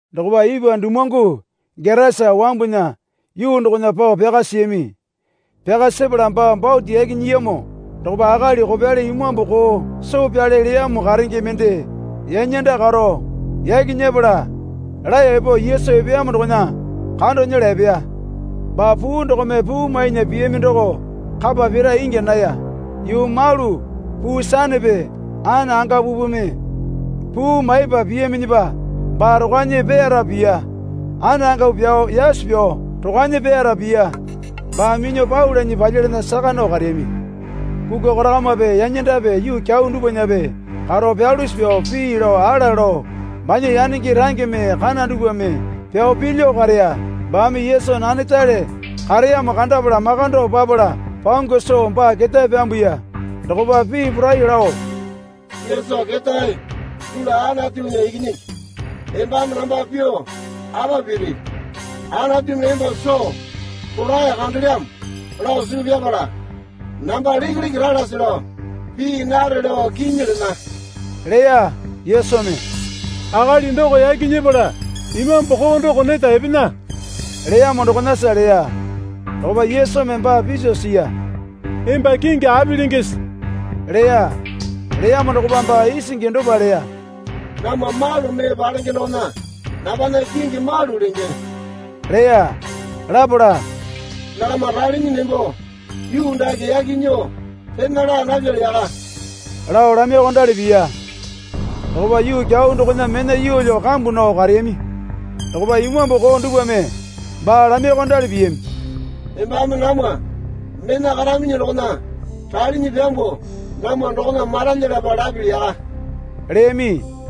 Dokopa ipwa dumuwangu Getasa wambunya yuu dokona pao pyaka siyami. Pyaka sepala baa bote yaki nyiyamo dokopa akali kopyali imambu koo soo pyale leyamo karenge mende yanyanda karo yaki nyepala laeyo epo Yesu epeyamo dokona kando nyela epeya. Baa puu dokome puu mainya piyami doko kapa pira ingya naya. Yuu malu puu sanepe anangapupeme puu maipa piyaminyipa baa rokwanyi peyasa piya. Anangapu pyao yasu pyao rokwanyi peyasa piya. Baa minyuo pau lanyi palyalana saka nao kareyami. Kukwa korakamape yanyandape yuu kyau dupwanape karo pyalusi pyao pii lao ala lao banya yanenge rangeme kana dupwame pyao pilyuo kareya. Baame Yesu nanetale kareyamo kandapala makando papala pangu soo baa ketae pyambuya. Dokopa pii poraiyuo lao, Yesu ketae dulu Anatunya Ikinyingi, embame namba pyuo apa piri? Anatumi emba soo rolae kandelyamo lao suu pyapala namba lekeleke ralase lao pii nare lao kinyi lena, leya. Yesumi, Akali doko yaki nyepala imambu koo doko neta epena, leyamo dokonasa leya. Dokopa Yesumi baa piso siya. Emba kingi api lengese? leya. Leyamo dokopa baa isingi dopa leya. Namwa malu mee palenge dokona nambana kingi malu lenge, leya. Lapala, Nakama ralinyi nembo yuu dake yaki nyuo pena laa napyali yaka, lao lamaiyuokondali piya. Dokopa yuu kyau dokona mena yuwalyu kambu nao kareyami. Dokopa imambu koo dupwame baa lamaiyuokondali piyami. Embame namwa mena karaminyi dokona ralinyi pyambuo namwa dokona maralyalapa lapili yaka, leyami.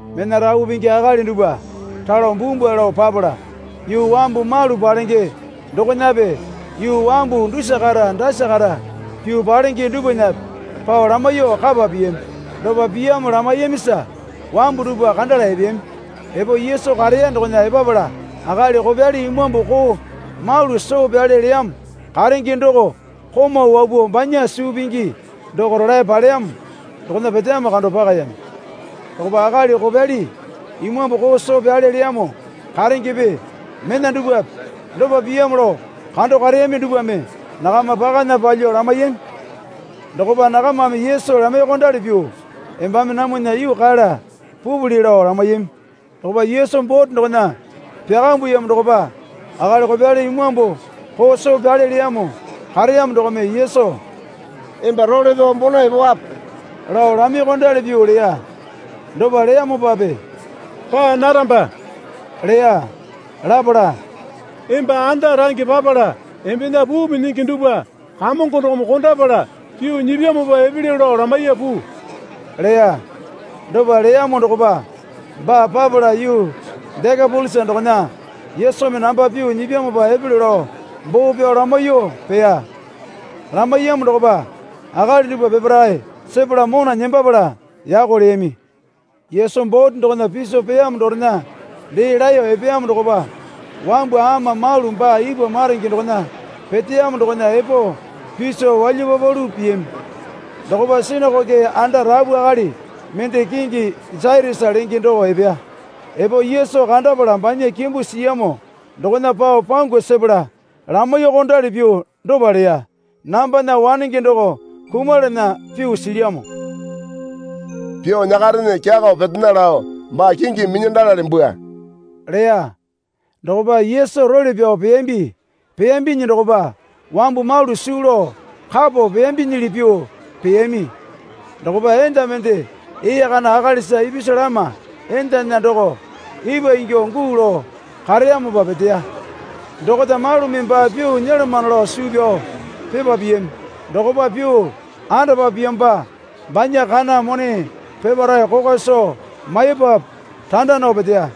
Mena rapu pingi akali dupwa ralo bumbwa lao papala, yuu wambu malu palenge dokonape yuu wambu dusa kata dasa kata pyuo palenge dupwanape pao lamaiyuo kapa piyami. Dopa pyamo lamaiyamisa wambu dupwa kandala epeyami. Epo Yesu kareya dokona epapala akali kopyali imambu koo malu soo pyale leyamo karenge doko komau wapuo banya suu pingi doko rolae paleyamo dokona peteyamo kando pakayami. Dokopa akali kopyali imambu koo soo pyale leyamo karengepe mena dupwape dopa pyamo lao kando kareyami dupwame nakama pakana palyuo lamaiyami. Dokopa nakamame Yesu lamaiyuokondali pyuo, Embame namwana yuu kala pupili, lao lamaiyami. Dokopa Yesu bote dokona pyakambuyamo dokopa akali kopyali imambu koo soo pyale leyamo kareyamo dokome Yesu, Emba role pyao bona epowape, lao lamaiyuokondali pyuo leya. Dopa leyamopape, Paa naramba, leya. Lapala, Emba anda range papala embena puu minyingi dupwa Kamongo dokome kondapala pyuo nyipyamopa epelyo lao lamaiya puu, leya. Dopa leyamo dokopa baa papala yuu Dekapolisa dokona, Yesumi namba pyuo nyipyamopa epelyo lao boo pyao lamaiyuo peya. Lamaiyamo dokopa akali dupwa peparae sepala mona nembapala yako leyami. Yesu bote dokona piso peyamo dorena dee laeyo epeyamo dokopa wambu ama malu baa ipwa maronge dokona peteyamo dokona epo piso walyapapalu piyami. Dokopa sinakoke anda rapu akali mende kingi Jairasa lenge doko epeya. Epo Yesu kandapala banya kimbu siyamo dokona pao pangu sepala lamaiyuokondali pyuo dopa leya. Nambana wanenge doko kumalana pyuo silyamo. Pyuo nyakarene, kyakao petena lao baa kingimi minyandalale bwua, leya. Dokopa Yesu role pyao peyambi. Peyambinyi dokopa wambu malu suu lao kapo peyambinyili pyuo peyami. Dokopa enda mende ee kana akalisa ipisu lama endana doko ipwa ingyuo guu lao kareyamopa peteya. Dokota malumi baa pyuo nyolomano lao suu pyao pipa piyami dokopa pyuo andapa piyamopa banya kana mone peparae kokwa soo maipapu randa nao peteya.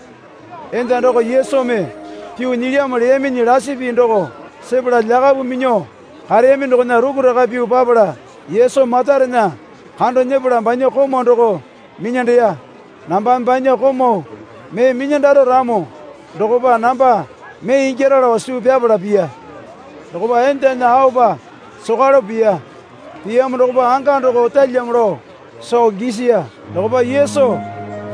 Enda doko Yesumi pyuo nyilyamo leyaminyi lasi pii doko sepala lyakapu minyuo kareyami dokona rukuraka pyuo papala Yesu matarena kando nyepala banya komau doko minyandeya. Nambame banya komau mee minyandaro ramo dokopa namba mee ingyara lao suu pyapala piya. Dokopa endana aopa sokwalepo piya. Piyamo dokopa anga doko otalyamo lao soo gisiya. Dokopa Yesu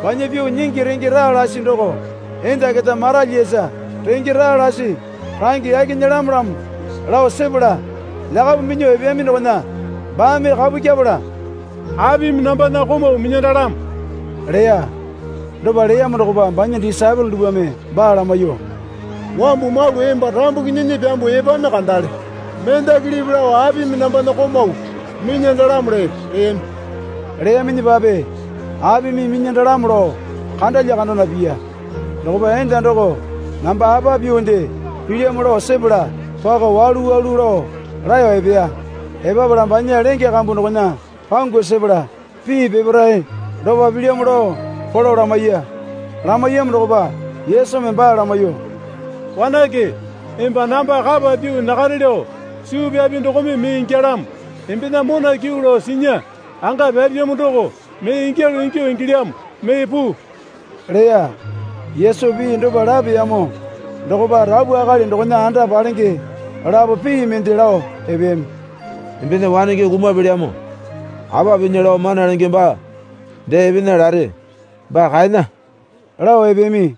banya pyuo nyingi renge raa lasi doko enda keta maralyiyasa renge raa lasi range yaki nyelamolamo lao sepala lyakapu minyuo epeyami dokona baame kapu kyeapala, Apimi nambana komau minyandalamo? leya. Dopa leyamo dokopa banya disaepole dupwame baa lamaiyuo, Wambu malu emba rambuki nyinyi pyambuo epami kandale. Mendakilipi lao apimi nambana komau minyandalamo lepe? leyami. Leyaminyipape apimi minyandalamo lao kandalya kandana piya. Dokopa enda doko namba apa pyuonde pilyamo lao sepala pako walu walu lao laeyo epeya. Epapala banya lenge kambu dokona pangu sepala pii peparae dopa pilyamo lao polo lamaiya. Lamaiyamo dokopa Yesumi baa lamaiyuo. Wanake, emba namba kapa pyuo nyakare lao suu pyapi dokome mee ingyalamo. Embena mona kyuu lao sinya, anga pyapyamo doko mee ingyalu ingyuo ingilyamo mee puu, leya. Yesu pii dopa lapeyamo dokopa rapu akali dokona anda palenge lapo pii mende lao epeyami. Embena wanenge kumapelyamo. Apa pinya lao Mana Lenge baa dee epena lare. Baa kaena, lao epeyami.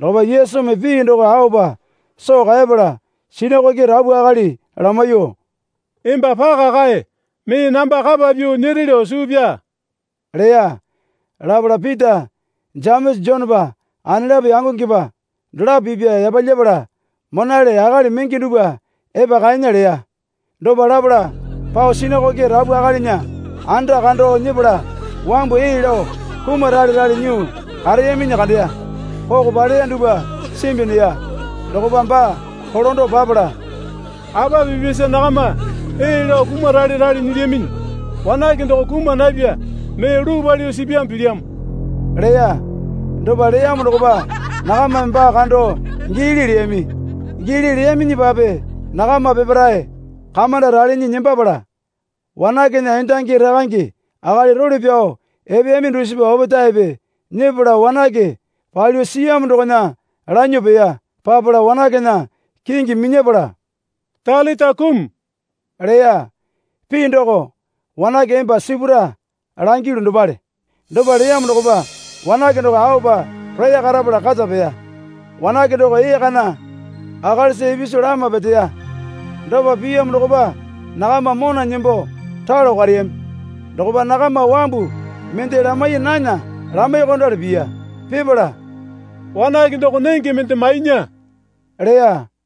Dokopa Yesumi pii doko aopa soo kaepala sinakoke rapu akali lamaiyuo, Emba paka kae. Mee namba kapa pyuo nyere lao suu pyaa, leya. Lapala Pita Jemesa Jonepa anelapo yangongepa dolapo pipya yapalyapala, Monale akali menge dupwa epa kaena, leya. Dopa lapala pao sinakoke rapu akalinya anda kando nyepala wambu ee lao kumaralerale nyuo kareyaminyi kandeya. Koko paleya dupwa simbi neya. Dokopa baa kolando papala, Apa pipyasa nakama ee lao kumaralerale nyilyaminyi? Wanake doko kuma napya. Mee luu palyuo sipyamo pilyamo, leya. Dopa leyamo dokopa nakamame baa kando giili leyami. Giili leyaminyipape nakama peparae kamanda ralinyi nembapala wanakena endangi rakange akali role pyao epeyami dusipa opetaepe nyepala wanake palyuo siyamo dokona lanyuo peya. Papala wanakena kingi minyapala, Talita kumi, leya. Pii doko, Wanake, emba sipura langilyu, dopale. Dopa leyamo dokopa wanake doko aopa roya karapala kata peya. (Wanake doko ee kana akalisa ipisu lama peteya.) Dopa piyamo dokopa nakama mona nembo ralo kareyami. Dokopa nakama wambu mende lamai nana lamaiyuokondali piya. Pipala, Wanake doko nenge mende mainya, leya.